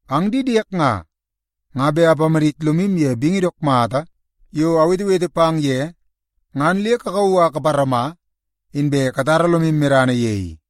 Ang di diek nga, nga bet apamadit lomu ye bingi dook mata yo awetewete pang ye, ngan le kakauu a kaparama, inbe katara lomu medana ye i.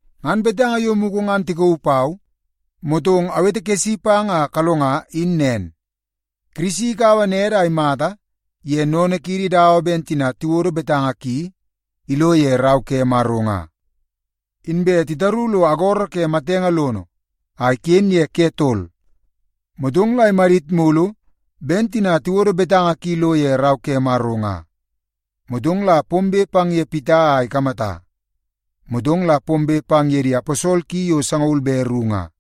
Ngan betanga yo mugu ngan tikauu pau, motong awetekesi pang a kalonga in nen: Kirisi ikaua nede a imata ye sennene kiidi dawa ben tina tiwodo betanga ki ilo ye Rau ke Maro nga. Inbe titaru lo agoro ke matenge lono a iken ye ke tol, motong la imadit mulu ben tina tiwodo betanga ki lo ye Rau ke Maro nga. Motong la pombe pang ye Pita a ikamata, motong la pombe pang ye di aposol ki yo sangaul be ru nga.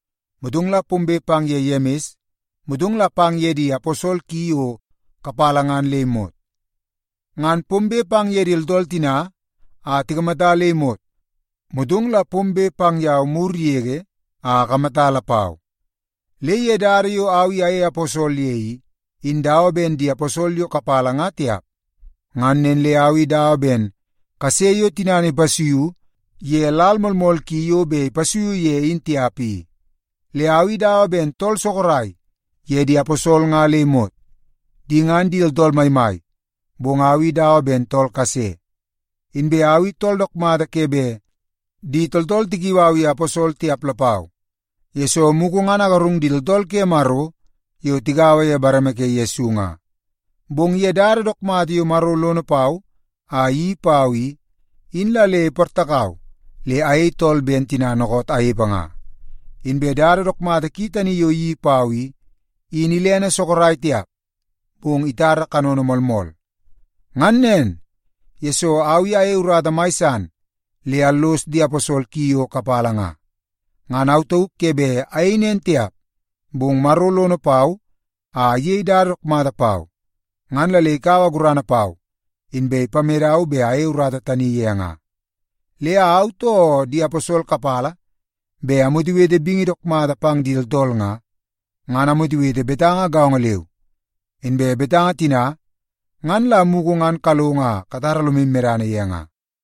Motong la pombe pang ye Yemis, motong pang ye di aposol ki yo kapala ngan le imot. Ngan pombe pang ye di tooltool tina a tikamata le imot, motong la pombe pang yau mur yege a akamata lapau. Le ye dada yo au i ayei aposol ye i, in dawa ben di aposol yo kapala nga tiap. Ngan nen le au i dawa ben kase yo tinana ipasuiu ye lal moolmool ki yo bet ipasuiu ye in tiap i. Le au i dawa ben tool sorok ye di aposol nga le imot. Di ngan di tooltool maimai, bong au i dawa ben tool kase. Inbe au i tool dook mata ke bet di tooltool tikiu au ye aposol tiap lapau, yesoo mugu ngan agarung di tooltool ke Maro yo tigaua ye bareme ke Yesu nga. Bong ye dada dook mata yo Maro lono pau a iyeii pau i, in la le iportakau le ayei tool ben tina dookoot anepe nga. Inbe dada dook mata ki tani yo iyeii pau i, in ilene sorok tiap, bong itara kanono moolmool. Ngan nen, yesoo au i ayei urata mai san le allos di aposol ki yo kapala nga. Ngan au tauk ke bet ayei nen tiap, bong Maro lono pau a iyei dada dook mata pau ngan la le ikaua gurana pau, inbe ipamedau bet ayei urata tani ye nga. Le au, too di aposol kapala bet amwetewete bingi dook mata pang di tooltool nga, ngan amwetewete ye betanga gaongo leu. Inbe betanga tina ngan la mugu ngan kalongo a katara lomu medana ye nga.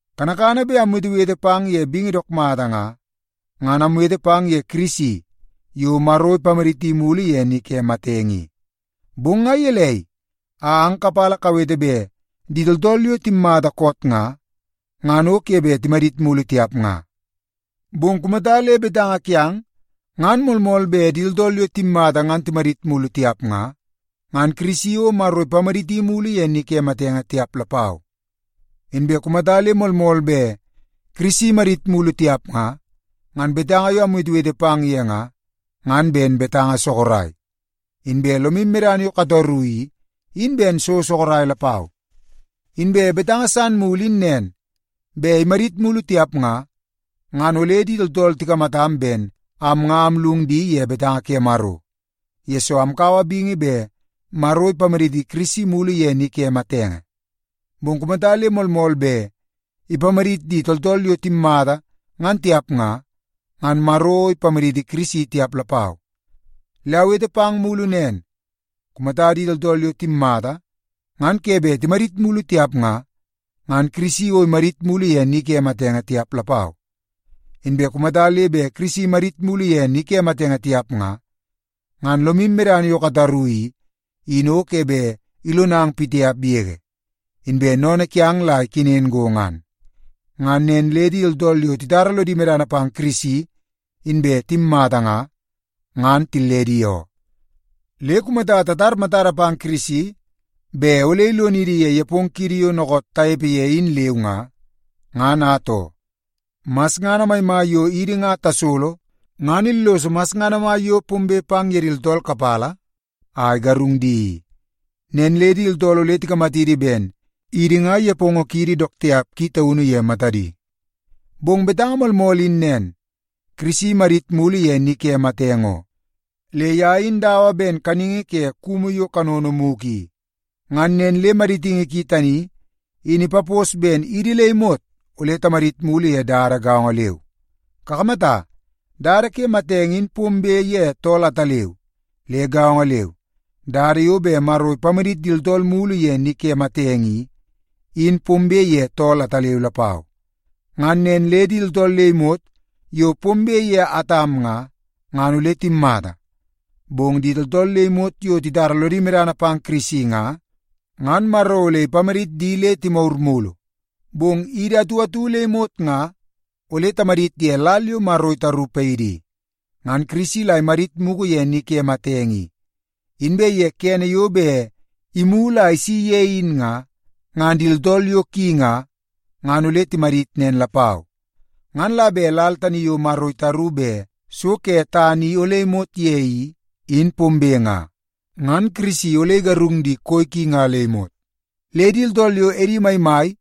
Kanakana bet amwetewete pang ye bingi dook mata nga, ngan amwete pang ye Kirisi yo Maro ipamaditi mulu ye ni ke matenge i. Bong nga gelei a ang kapala kawete bet di tooltool yo timmata koot nga, ngan o ke bet timadit mulu tiap nga? Bong kumata le betanga kiang ngan moolmool bet di tooltool yo timmata ngan timadit mulu tiap nga, ngan Kirisi o Maro ipamaditi mulu ye ni ke matenge tiap lapau. Inbe kumata le moolmool bet Kirisi imadit mulu tiap nga, ngan betanga yo amwetewete pang ye nga, ngan ben betanga sorok. Inbe lomu medana yo kataru i, in ben so sorok lapau. Inbe betanga san mulu in nen, bet imadit mulu tiap nga, ngan ole di tooltool tikamatam ben am nga amllung di ye betanga ke Maro, yesoo amkaua bingi bet Maro ipamaditi Kirisi mulu ye ni ke matenge. Bong kumata le moolmool bet ipamadit di tooltool yo timmata ngan tiap nga, ngan Maro o ipamaditi Kirisi tiap lapau. Le awete pang mulu nen, kumata di tooltool yo timmata ngan ke bet timadit mulu tiap nga, ngan Kirisi o imadit mulu ye ni ke matenge tiap lapau. Inbe kumata le bet Kirisi imadit mulu ye ni matenge tiap nga, ngan lomu medana yo kataru i, in o ke bet ilonang pitiap yege, inbe sennene kiang la ikenen go ngan. Ngan nen le di tooltool yo titara lodi medana pang Kirisi inbe timmata nga, ngan tilledi oo. Le kumata tatar matada pang Kirisi bet ole ilonidi ye nepongo kiidi yo dookoot tanepe ye in leu nga, ngan atoo, masngana maimai yo idi nga tasolo ngan illoso masngana mai yo pombe pang ye di tooltool kapala a igarung di i. Nen le di tooltool ole tikamatidi ben idi nga nepongo kiidi dook tiap ki taunu ye matadi. Bong betanga moolmool in nen, Kirisi imadit mulu ye ni ke matenge oo. Le ye in dawa ben kaningi ke kumu yo kanono mugu i. Ngan nen le maditingi ki tani in ipapos ben idi le imot ole timadit mulu ye dada gaongo leu. Kakamata, dada ke matenge in pombe ye tool ataleu. Le gaongo leu, dada yo bet Maro ipamadit di tooltool mulu ye ni ke matenge i, in pombe ye tool ataleu lapau. Ngan nen le di tooltool le imot yo pombe ye Atam nga, ngan ole timmata. Bong di tooltool le imot yo titara lodi medana pang Kirisi nga, ngan Maro ole ipamadit di le timagur mulu. Bong idi atu atu le imot nga ole tamadit ye lal yo Maro itaru paidi i. Ngan Kirisi la imadit mugu ye ni ke matenge i. Inbe ye kene yo bet imulu a isi ye in nga, ngan di tooltool yo ki nga, ngan ole timadit nen lapau. Ngan la bet lal tani yo Maro itaru bet so ke tana i ole imot ye i, in pombe nga, ngan Kirisi ole igarung di koi ki nga le imot. Le di tooltool yo edi maimai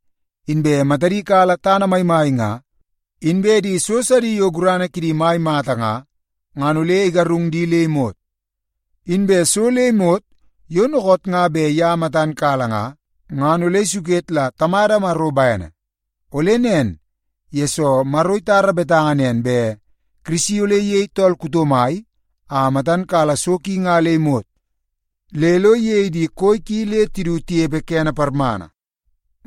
inbe matadi kala tana maimai nga, inbe di so sidi yo gurana kidi mai mata nga, ngan ole igarung di le imot. Inbe so le imot yo dookoot nga bet ye matan kala nga, ngan ole isuket la Tamada Maro bene. Ole nen, yesoo Maro itara betanga nen bet Kirisi ole iyei tool kuto mai a matan kala so ki nga le imot le lo iyei di koi ki le du tinepe kene parmana.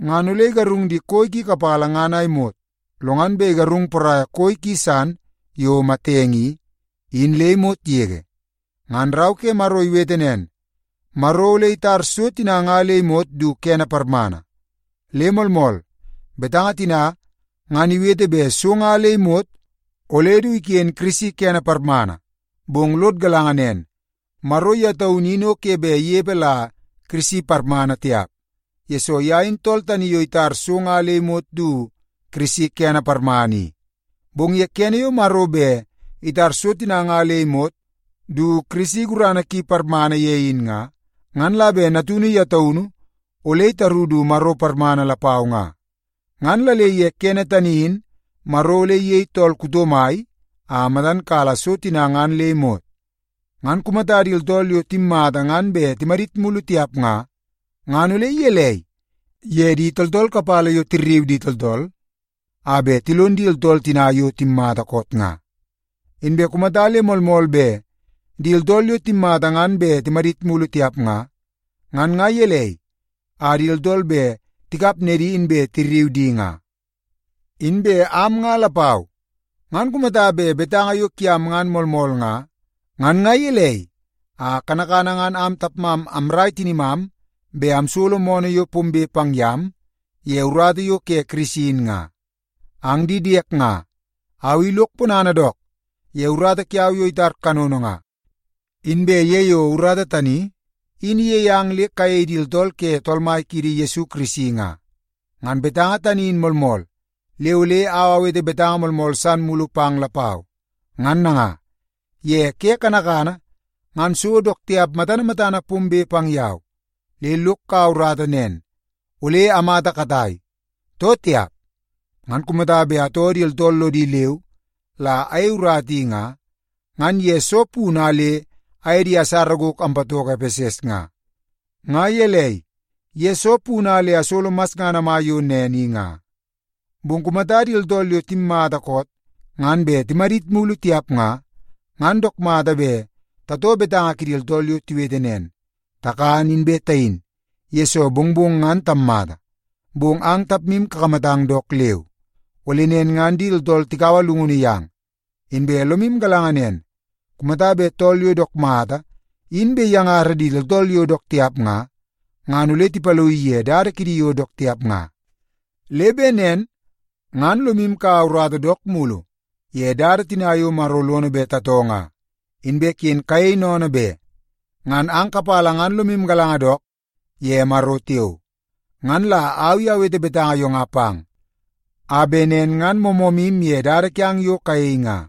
Ngan ole igarung di koi ki kapala ngan a imot, lo ngan bet igarung poraia koi ki san yo matenge i, in le imot yege. Ngan Rau ke Maro iwete nen, Maro ole itar “so tina nga le imot du kene parmana.” Le moolmool, betanga tina ngan iwete bet so nga le imot ole du iken Kirisi kene parmana. Bong lod galanga nen, Maro ye taunu in o ke bet inepe la Kirisi parmana tiap, yesoo ye in tool tani yo itar so nga le imot du Kirisi kene parmana i. Bong ye kene yo bet Maro itar so tina nga le imot du Kirisi gurana ki parmana ye in nga, ngan la bet Natunu ye taunu ole itaru du Maro parmana lapau nga. Ngan la le ye kene tani in Maro ole iyei tool kuto mai a matan kala so tina ngan le imot. Ngan kumata di tooltool yo timmata ngan bet timadit mulu tiap nga, ngan ole gelei ye di tooltool kapala yo tirriu di tooltool a bet tilon di tooltool tina yo timmata koot nga? Inbe kumata le moolmool bet di tooltool yo timmata ngan bet timadit mulu tiap nga, ngan nga gelei a di tooltool bet tikap nedi inbe tirriu di nga? Inbe am nga lapau, ngan kumata bet betanga yo kiang ngan moolmool nga, ngan nga gelei a kanakana ngan am tapmam amrai tinimam bet amsolo moonoo yo pombe pang yam ye urata yo ke Kirisi in nga? Ang di diek nga, au i lok ponana dook ye urata kiau yo itar kanono nga, inbe ye yo urata tani in iyei ang le kayei di tooltool ke Tool Mai kiidi Yesu Kirisi nga. Ngan betanga tani in moolmool, le ole au awete betanga moolmool san mulu pang lapau. Ngan nanga, ye ke kanakana ngan so dook tiap matana matana pombe pang yau, le lok kaua urata nen, ole amata katai, too tiap. Ngan kumata bet atoo di tooltool lodi leu la ayei urata i nga, ngan ye soo punu a le aye di asara gok ampatoko Epeses nga? Nga gelei, ye soo punu a le asolo masngana mai yo nen in, nga? Bong kumata di tooltool yo timmata koot ngan bet timadit mulu tiap nga, ngan dook mata bet tatoo betanga kidi tooltool yo tiwete nen, “Takan inbe tayin, yesoo mongmong ngan tammata.” Bong ang tapmu kakamatang dook leu, ole nen ngan di tooltool tikaua llungunu yang. Inbe lomu galanga nen, kumata bet tool yo dook mata in bet iyangara di tooltool yo dook tiap nga, ngan ole tipaloii ye dada kidi yo dook tiap nga. Le bet nen ngan lomu kaua urata dook mulu ye dada tina yo Maro lono bet tatoo nga, inbe ken kayei sennene be. Ngan ang kapala ngan lomu galanga dook ye Maro tiao. Ngan la au i awete betanga yo nga pang, a bet nen ngan moomoomu ye dada kiang yo kayei nga.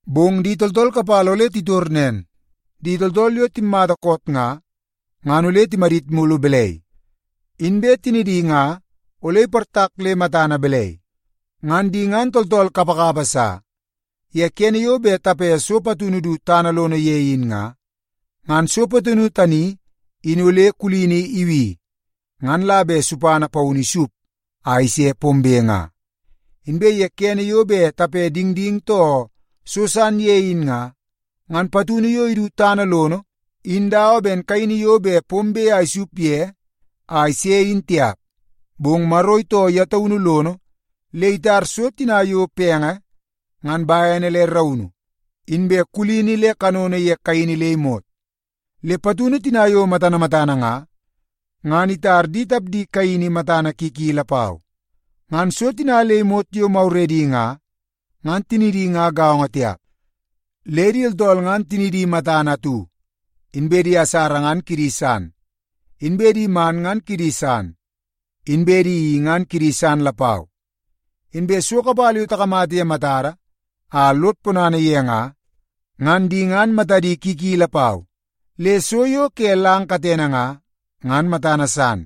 Bong di tooltool kapala ole titor nen, “Di tooltool yo timmata koot nga, ngan ole timadit mulu balai? Inbe tinidi nga ole iportak le matana balai?” Ngan di ngan tooltool kapakapa sa! Ye kene yo bet tape so patunu du tana lono ye in nga, ngan so patunu tani in ole kulini ibi ngan la bet supana paunu isup a ise pombe nga. Inbe ye kene yo bet tape dingding too so san ye in nga, ngan patunu yo idu tana lono in dawa ben kaini yo bet pombe a isup ye a ise in tiap. Bong Maro itoo ye taunu lono le itar so tina yo penge ngan bene le raunu, inbe kulini le kanono ye kaini le imot. Le patunu tina yo matana matana nga, ngan itar di tapdi kaini matana ki ki lapau. Ngan so tina le imot yo maguredi nga, ngan tinidi nga gaongo tiap. Le di tooltool ngan tinidi matana atu, inbe di asara ngan kidi san, inbe di man ngan kidi san, inbe di i ngan kidi san lapau. Inbe so kapala yo takamata ye matada a lod ponana ye nga, ngan di ngan matadi ki ki lapau. Le so yo ke lang katene nga, ngan matana san,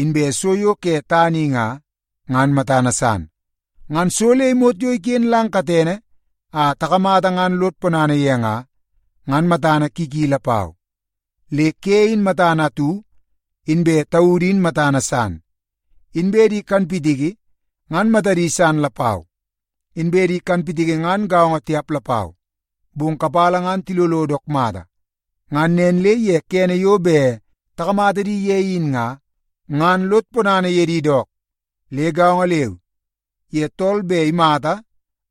inbe so yo ke tana i nga, ngan matana san. Ngan so le imot yo iken lang katene a takamata ngan lod ponana ye nga, ngan matana ki ki lapau. Le ke in matana atu, inbe taudu in matana san, inbe di kanpitiki ngan matadi san lapau. Inbe di kanpitiki ngan gaongo tiap lapau, bong kapala ngan tilolo dook mata, ngan nen le ye kene yo bet takamata di ye in nga, ngan lod ponana ye di dook. Le gaongo leu, ye tool bet imata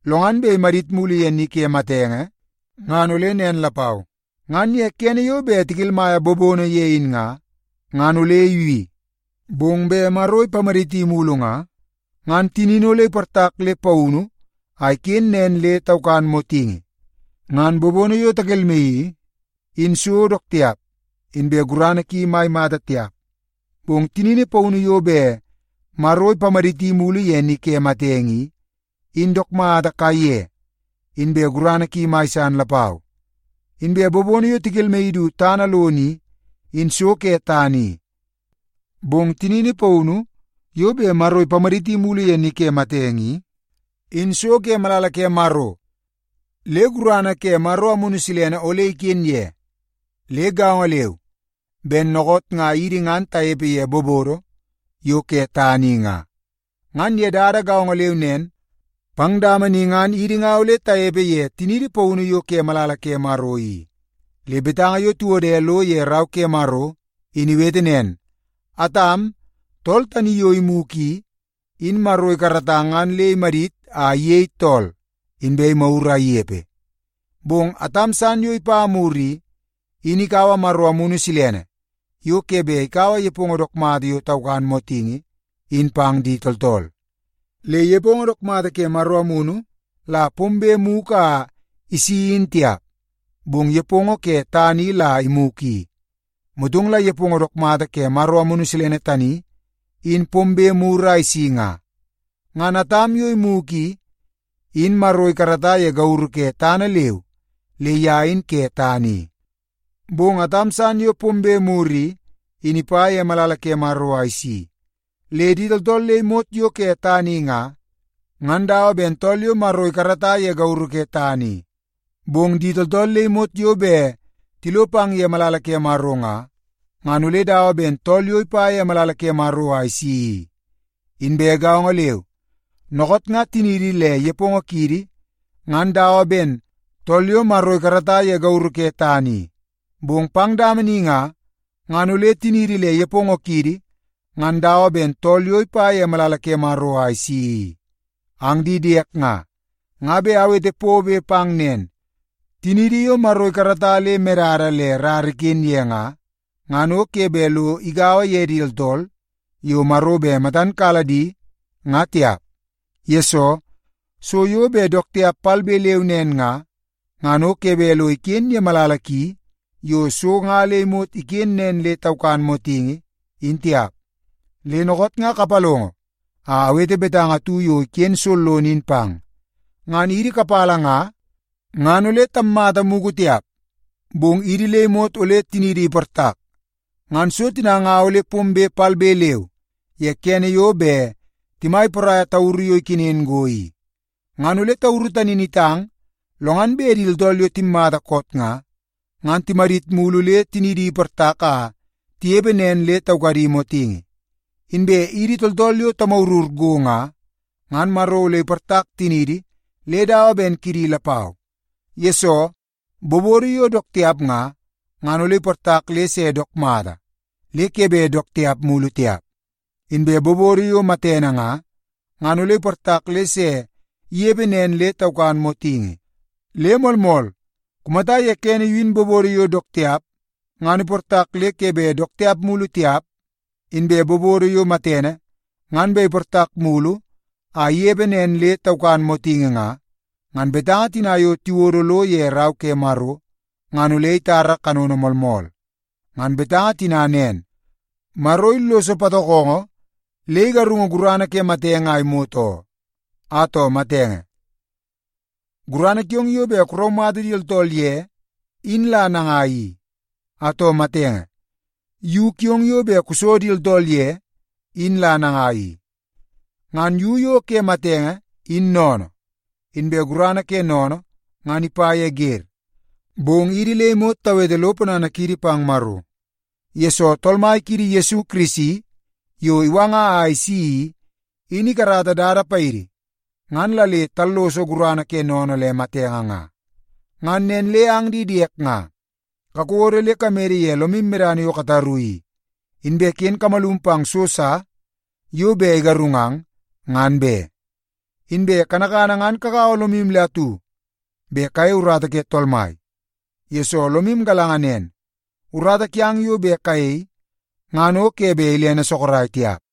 lo ngan bet imadit mulu ye ni ke matenge ngan ole nen lapau. Ngan ye kene yo bet tikelmaia bobono ye in nga, ngan ole ibi. Bong bet Maro ipamaditi mulu nga, ngan tinini ole iportak le paunu a iken nen le taukan motingi. Ngan bobono yo takelmaii i, in so dook tiap inbe gurana ki mai mata tiap. Bong tinini paunu yo bet Maro ipamaditi mulu ye ni ke matenge i, in dook mata kaiye inbe gurana ki mai san lapau. Inbe bobono yo tikelmaii du tana lono i, in so ke tana i. Bong tinini paunu yo bet Maro ipamaditi mulu ye ni ke matenge i, in so ke malala ke Maro le gurana ke Maro Amunu Silene ole iken ye. Le gaongo leu ben dookoot nga idi ngan tanepe ye bobodo yo ke tana i nga, ngan ye dada gaongo leu nen pang dama ni ngan idi nga ole tanepe ye tiniidi paunu yo ke malala ke Maro i. Le betanga yo tiwode lo ye Rau ke Maro in iwete nen, “Atam, tool tani yo imugu i, in Maro ikarata ngan le imadit a iyei tool, inbe imagur a inepe.” Bong Atam san yo pombe mur i, in ikaua Maro Amunu Silene yo ke bet ikaua nepongo dook mata yo taukan motingi in pang di tooltool i. Le nepongo dook mata ke Maro Amunu la pombe mugu a isi in tiap, bong nepongo ke tana i la imugu i. Motong la nepongo dook mata ke Maro Amunu tani in pombe mur a isi nga. Ngan Atam yo imugu i, in Maro ikarata ye gauru ke tana leu le ye in ke tana i. Bong Atam san yo pombe mur i, in ipa ye malala ke Maro a isi. Le di tooltool le imot yo ke tana i nga, ngan dawa ben tool yo Maro ikarata ye gauru ke tana i. Bong di tooltool le imot yo bet tilo pang ye malala ke Maro nga, ngan ole dawa ben tool yo ipa ye malala ke Maro a isi i. Inbe gaongo leu, dookoot nga tiniidi le nepongo kiidi ngan dawa ben tool yo Maro ikarata ye gauru ke tana i. Bong pang dama ni nga, ngan ole tiniidi le nepongo kiidi ngan dawa ben tool yo ipa ye malala ke Maro a isi i. Ang di diek nga, nga bet awete pobe pang nen, tiniidi yo Maro ikarata le medada le rara iken ye nga, ngan o ke bet lo igaua ye di tooltool yo Maro bet matan kala di nga tiap. Yesoo, so yo bet dook tiap palbe leu nen nga, ngan o ke bet lo iken ye malala ki yo so nga le imot iken nen le taukan motingi, in tiap. Le dookoot nga kapalongo a awete betanga atu yo iken sollono in pang. Ngan idi kapala nga, ngan ole tammata mugu tiap, bong idi le imot ole tiniidi iportak. Ngan so tina nga ole pombe palbe leu ye kene yo bet timai poraia tauru yo ikenen go i. Ngan ole tauru tani in itang lo ngan bet di tooltool yo timmata koot nga, ngan timadit mulu le tinidi iportak a tinepe nen le taukadi motingi. Inbe idi tooltool yo tamagurur go nga, ngan Maro ole iportak tiniidi le dawa ben kidi lapau. Yesoo, bobodo yo dook tiap nga, ngan ole iportak le se dook mata le ke bet dook tiap mulu tiap. Inbe bobodo yo matene nga, ngan ole iportak le se inepe nen le taukan motingi. Le moolmool, kumata ye kene in bobodo yo dook tiap, ngan iportak le ke bet dook tiap mulu tiap, inbe bobodo yo matene, ngan bet iportak mulu a inepe nen le taukan motingi nga, ngan betanga tina yo tiwodo lo ye Rau ke Maro ngan ole itar kanono moolmool. Ngan betanga tina nen, “Maro illoso patokongo, le igarungu gurana ke matenge a imot oo.” “Atoo matenge, gurana kiong yo bet kuraumata di tooltool ye in la nangai i? Atoo matenge, yu kiong yo bet kuso di tooltool ye in la nangai i?” Ngan yu yo ke matenge in sennene, inbe gurana ke sennene ngan ipa ye wer. Bong idi le imot tawete lo ponana kiidi pang Maro, yesoo Tool Mai kiidi Yesu Kirisi yo iwanga a isi i, in ikarata dada paidi ngan la le talloso gurana ke sennene le matenge nga. Ngan nen le ang di diek nga, kakodo le kamede ye lomu medana yo kataru i, inbe ken kamalum pang so sa yo bet igarungang ngan be. Inbe kanakana ngan kagaua lomu le atu bet kayei urata ke Tool Mai, yesoo lomu galanga nen, urata kiang yo bet kayei ngan o ke bet ilene sorok tiap.